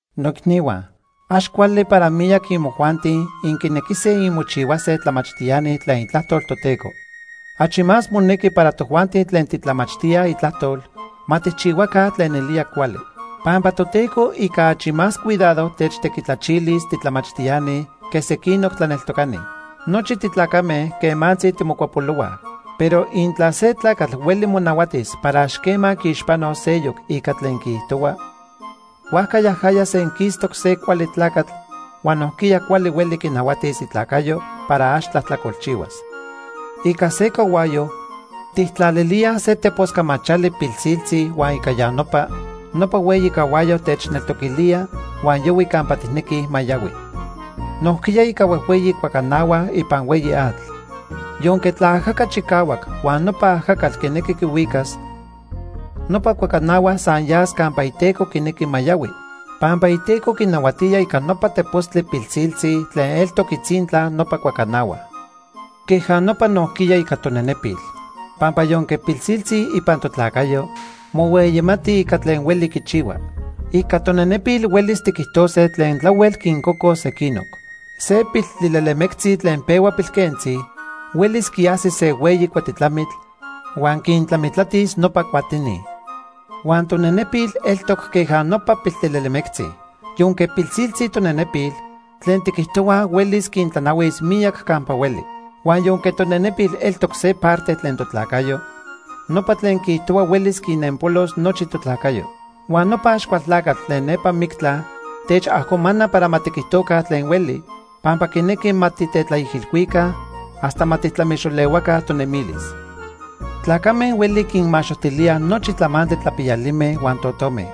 Noicnihua, ax cuali para miyac imojuanti inquinequise inmochihuase tlamachtiani tlen Itlajtol Toteco. Achi más monequi para tojuanti tlen titlamachtíaj Itlajtol ma tijchihuaca tlen nelía cuali. Pampa Toteco ica achi más cuidado techtequitlachilis titlamachtiani que sequinoc tlaneltocani. Nochi titlacame quemantzi timocuapolohuaj. Pero intla se tlacatl hueli monahuatis para ax quema quiixpanos seyoc ica tlen quiijtohua, huajca yajaya senquistoc se cuali tlacatl huan nojquiya cuali hueli quinahuatis itlacayo para ax tlajtlacolchihuas. Ica se cahuayo, tijtlalilíaj se tepos camachali pilsiltzi huan ica ya nopa, nopa hueyi cahuayo techneltoquilía huan yahui campa tijnequij ma yahui. Nojquiya ica huejhueyi cuacanahua ipan hueyi atl, yonque tlaajaca chicahuac huan nopa ajacatl quinequi quihuicas, nopa cuacanahua san yas campa iteco quinequi ma yahui, pampa iteco quinahuatía ica nopa tepostli pilsiltzi tlen eltoc itzintla nopa cuacanahua. Queja nopa nojquiya ica tonenepil, pampa yonque pilsiltzi ipan totlacayo, mohueyimati ica tlen hueli quichihua. Ica tonenepil huelis tiquijtose tlen tlahuel quincocos sequinoc. Se piltlilelemectzi tlen pehua pilquentzi, huelis quiajsis se hueyi cuatitlamitl, huan quintlamitlatis nopa cuatini. Huan tonenepil eltoc queja nopa piltlilelemectzi. Yonque pilsiltzi tonenepil, tlen tiquijtohuaj huelis quintlanahuis miyac campa hueli. Huan yonque tonenepil eltoc se parte tlen totlacayo, nopa tlen quiijtohua huelis quinenpolos nochi totlacayo. Huan nopa Axcualtlacatl tlen nepa mictla techajcomana para ma tiquijtoca tlen hueli, pampa quinequi ma titetlaijilhuica hasta ma tijtlamixolehuaca tonemilis. Tlacame huelij quinmaxojtilíaj nochi tlamantli tlapiyalime huan totome.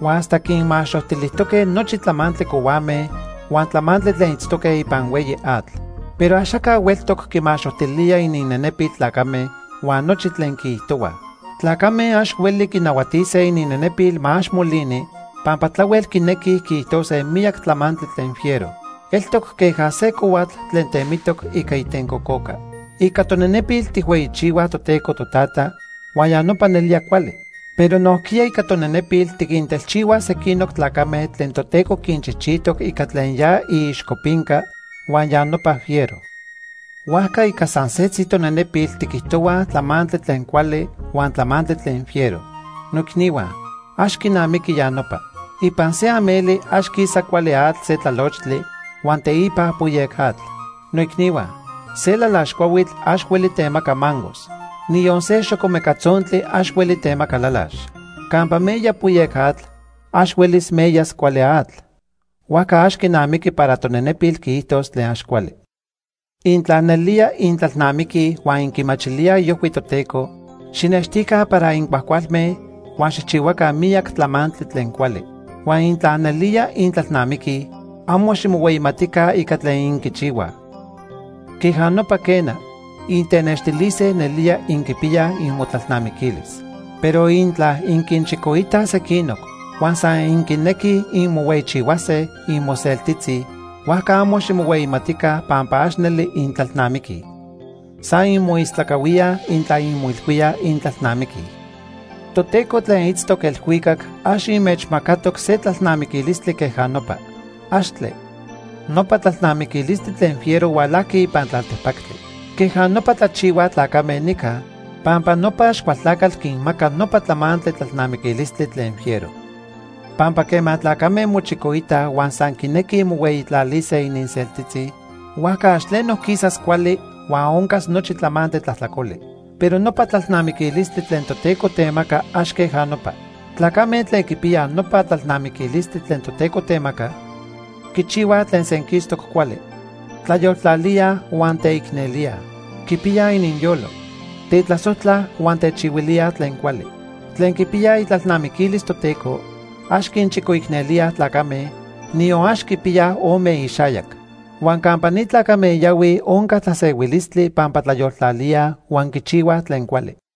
Huan hasta quinmaxojtilijtoque nochi tlamantli cohuame huan tlamantli tlen itztoque ipan hueyi atl. Pero axaca hueltoc quimaxojtilía ininnenepil tlacame huan nochi tlen quiijtohuaj. Tlacame ax hueli quinahuatise ininnenepil ma ax molini pampa tlahuel quinequij quiijtose miyac tlamantli tlen fiero. Eltoc queja se cohuatl tlen temitoc ica itencococa. Ica tonenepil tijhueyichihuaj Toteco Totata huan ya nopa nelía cuali, pero nojquiya ica tonenepil tiquintelchihuaj sequinoc tlacame tlen Toteco quinchijchijtoc ica tlen ya iixcopinca, huan ya nopa fiero. Huajca ica san setzi tonenepil tiquijtohuaj tlamantli tlen cuali huan tlamantli tlen fiero. Noicnihua, ax quinamiqui ya nopa. Ipan se ameli ax quisa cuali atl se tlalochtli huan teipa poyec atl. Noicnihua, se lalax cuahuitl ax hueli temaca mangos. Niyon se xocomeca tzontli ax hueli temaca lalax. Campa meya poyec atl, ax huelis meyas cuali atl. Huajca ax quinamiqui para tonenepil quiijtos tlen ax cuali. Intla nelía intlalnamiquij huan inquimachilíaj iojhui Toteco, xijnextica para incuajcualme huan xijchihuaca miyac tlamantli tlen cuali. Huan intla nelía intlalnamiquij, amo ximohueyimatica ica tlen inquichihuaj. Queja nopa quena, intenextilise nelía inquipiyaj inmotlalnamiquilis. Pero intla inquinchicoitaj sequinoc huan san inquinequij inmohueyichihuase inmoseltitzi, huajca amo ximohueyimatica pampa ax neli intlalnamiquij. San inmoistlacahuíaj intla inmoilhuíaj intlalnamiquij. Toteco tlen itztoc elhuicac ax inmechmacatoc se tlalnamiquilistli queja nopa. ¡Axtle! Nopa tlalnamiquilistli tlen fiero hualajqui ipan tlaltepactli. Queja nopa tlachihuaj tlacame nica, pampa nopa Axcualtlacatl quinmaca nopa tlamantli tlalnamiquilistli tlen fiero. Pampa quema tlacame mochicoitaj huan san quinequij mohueyitlalise ininseltitzi, huajca ax tleno quisas cuali huan oncas nochi tlamantli tlajtlacoli. Pero nopa tlalnamiquilistli tlen Toteco temaca ax queja nopa. Tlacame tlen quipiyaj nopa tlalnamiquilistli tlen Toteco temaca, quichihuaj tlen senquistoc cuali. Tlayoltlalíaj huan teicnelíaj. Quipiyaj ininyolo. Tetlasojtlaj huan techihuilíaj tlen cuali. Tlen quipiyaj itlalnamiquilis Toteco, ax quinchicoicnelíaj tlacame, niyon ax quipiyaj ome ixayac. Huan campa ni tlacame yahuij onca tlasehuilistli pampa tlayoltlalíaj huan quichihuaj tlen cuali.